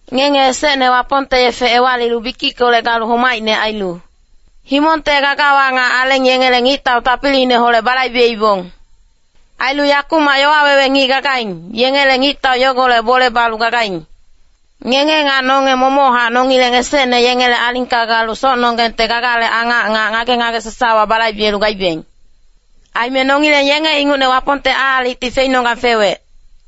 Ngenge esecne Wapongte yefe ewalilu bikickolec galu homaicne ailu, himongte gagawa nga aleng yengele ngictau tapiliineholec balaibeibong. Ailu yakumac yowa wewe ngic gagaing, yengele ngictau yogolec bole balu gagaing. Ngenge nga nonge momochac nongileng esecne yengele alingka galu socnonggengte gagale angac nga ngage-ngage sasawa balaibelu gaibeng. Aime nongileng yenge ingucne Wapongte aalicti feinonggang fewec.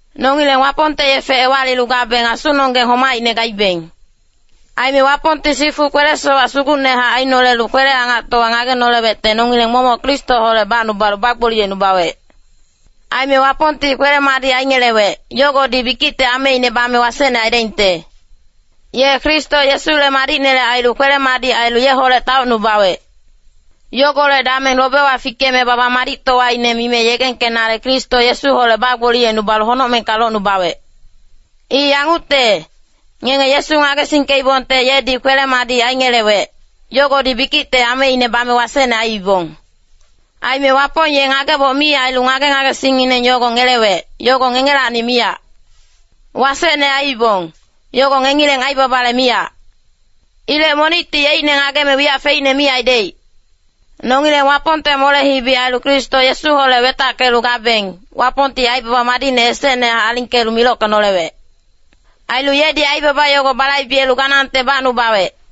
Nongileng Wapongte yefe ewalilu gabeng asunonggeng homaicne gaibeng. Aime Wapongti sifu kwele-sowac sugucnehac ainolelu kwele-angactowa ngagenolewecte nongileng momoc Kristoholec bacnubalu bagboliyecnubawec. Aime Wapongti kwele-madic aingelewec, yogodi bikicte ameine bame wasecne aidaingte. Ye Kristo Yesule madicnele ailu kwele-madic ailu yeholec taocnubawec. Yogolec dameng lobewa fikeme baba-madictowaine mime yegengkenale Kristo Yesuholec bagboliyecnubalu honocmengka locnubawec. I yangucte, ngenge Yesu ngagesingkeibongte yedi kwele-madic aingelewec, yogodi bikicte ameine bame wasecne aiibong. Aime Wapong ye ngageboc mi ailu ngage-ngagesingngineng yogo ngelewec, yogo ngengelacni miyac. Wasecne aiibong, yogo ngengileng aibabale miyac. Ilec monicti yeicne ngageme wiyac feicne mi aidaic. Nongileng Wapongte mole-hibi ailu Kristo Yesuholec wetackelu gabeng, Wapongti aibaba madicne esecnehac alingkelu milockenolewec. Ailu yedi aibaba yogo balaibelu ganangte bacnubawec.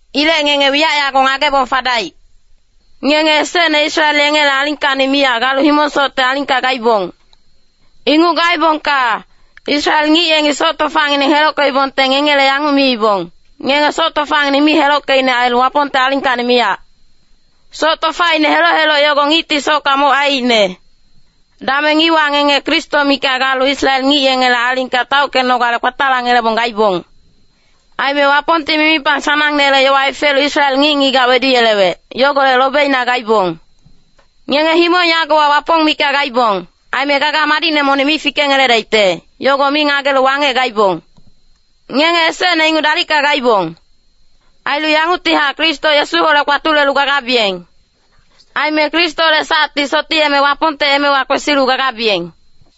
Ilec ngenge wiyac yago ngagebong fadaic. Ngenge esecne Israel yengele alingkacni miyac galu himong-socte alingka gaibong. Inguc gaebongka, Israel ngic yengi soc tofangineng helockeibongte ngengele yanguc miibong, “Ngenge soc tofangineng mi helockeicne ailu Wapongte alingkacni miyac.” Soc tofaine heloc-heloc yogo ngicti socka moc aiicne. Dameng iwa ngenge Kristo mikac galu Israel ngic yengele alingka taockenogale kpatalangelebong gaibong. Aime Wapongti mimipang sanangnele yowa hefelu Israel ngic-ngigac weduyelewec, yogolec lobeina gaibong. Ngenge himong yagowa Wapong mikac gaibong, aime gaga madicne monic fikengeledaicte, yogo mi ngagelu wangec gaibong. Ngenge esecne inguc dalicka gaibong. Ailu yanguctihac Kristo Yesuholec kpatulelu gagabiyeng. Aime Kristole sacti sotiyeme Wapongte emewa kwesilu gagabiyeng.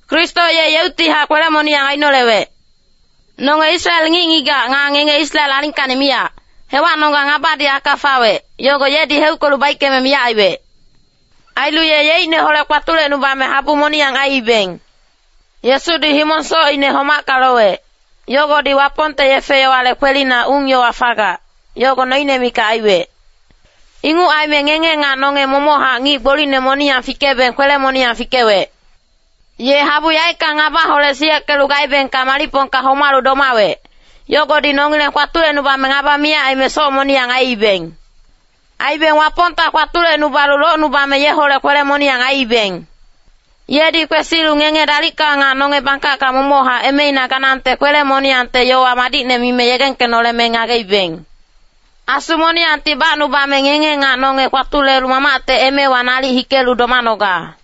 Kristo ye yeuctihac kwele-moniyang ainolewec. Nonge Israel ngic-ngigac nga ngenge Israel alingkacni miyac, hewacnonggang ngabadi aka fawec, yogo yedi heuckelu baickeme miyac aiwec. Ailu ye yeicneholec kpatulecnubame habu moniyang aiibeng. Yesudi himong-socine homacka lowec, yogodi Wapongte yefe-yowale kwelina ung-yowa fagac, yogo noine mikac aiwec. Inguc aime ngenge nga nonge momochac ngic gbolicne moniyang fikebeng kwele-moniyang fikewec. Ye habu yaeckang ngabaholec siyeckelu gaebengka malicpongka homalu domawec, yogodi nongileng kpatulecnubame ngaba miyac aime soc moniyang aiibeng. Aibeng Wapongta kpatulecnubalu locnubame yeholec kwele-moniyang aiibeng. Yedi kwesilu ngenge dalicka nga nonge bangkacka momochac emeina ganangte kwele-moniyangte yowa madicne mime yegengkenoleme ngageibeng. Asu moniyangti bacnubame ngenge nga nonge kpatulelu Mamacte emewa nalic hikelu domanoga.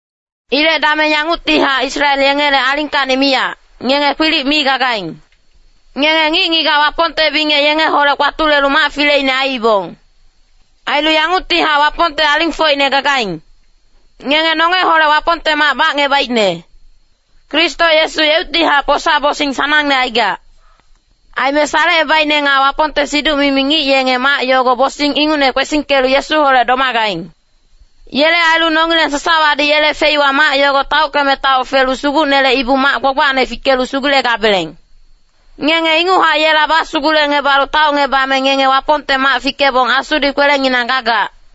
Ilec dameng yanguctihac Israel yengele alingkacni miyac, ngenge kwilic mi gagaing. Ngenge ngic-ngigac Wapongte bingec yengeholec kpatulelu mac fileine aiibong. Ailu yanguctihac Wapongte alingfocine gagaing. Ngenge nongeholec Wapongte mac bacngebaicne. Kristo Yesu yeuctihac posa-bosing sanangne aigac. Aime salecebaicne nga Wapongte siduc-mimi ngic yenge mac yogo bosing ingucne kwesingkelu Yesuholec domagaing. Yele ailu nongileng sasawadi yele feiwa mac yogo taockeme taoc felu Sugucnele ibu-mac gbagbacne fikelu sugulegabeleng. Ngenge inguchac yela basugulecngebalu taocngebame ngenge Wapongte mac fikebong Asudi kwelenginang gagac.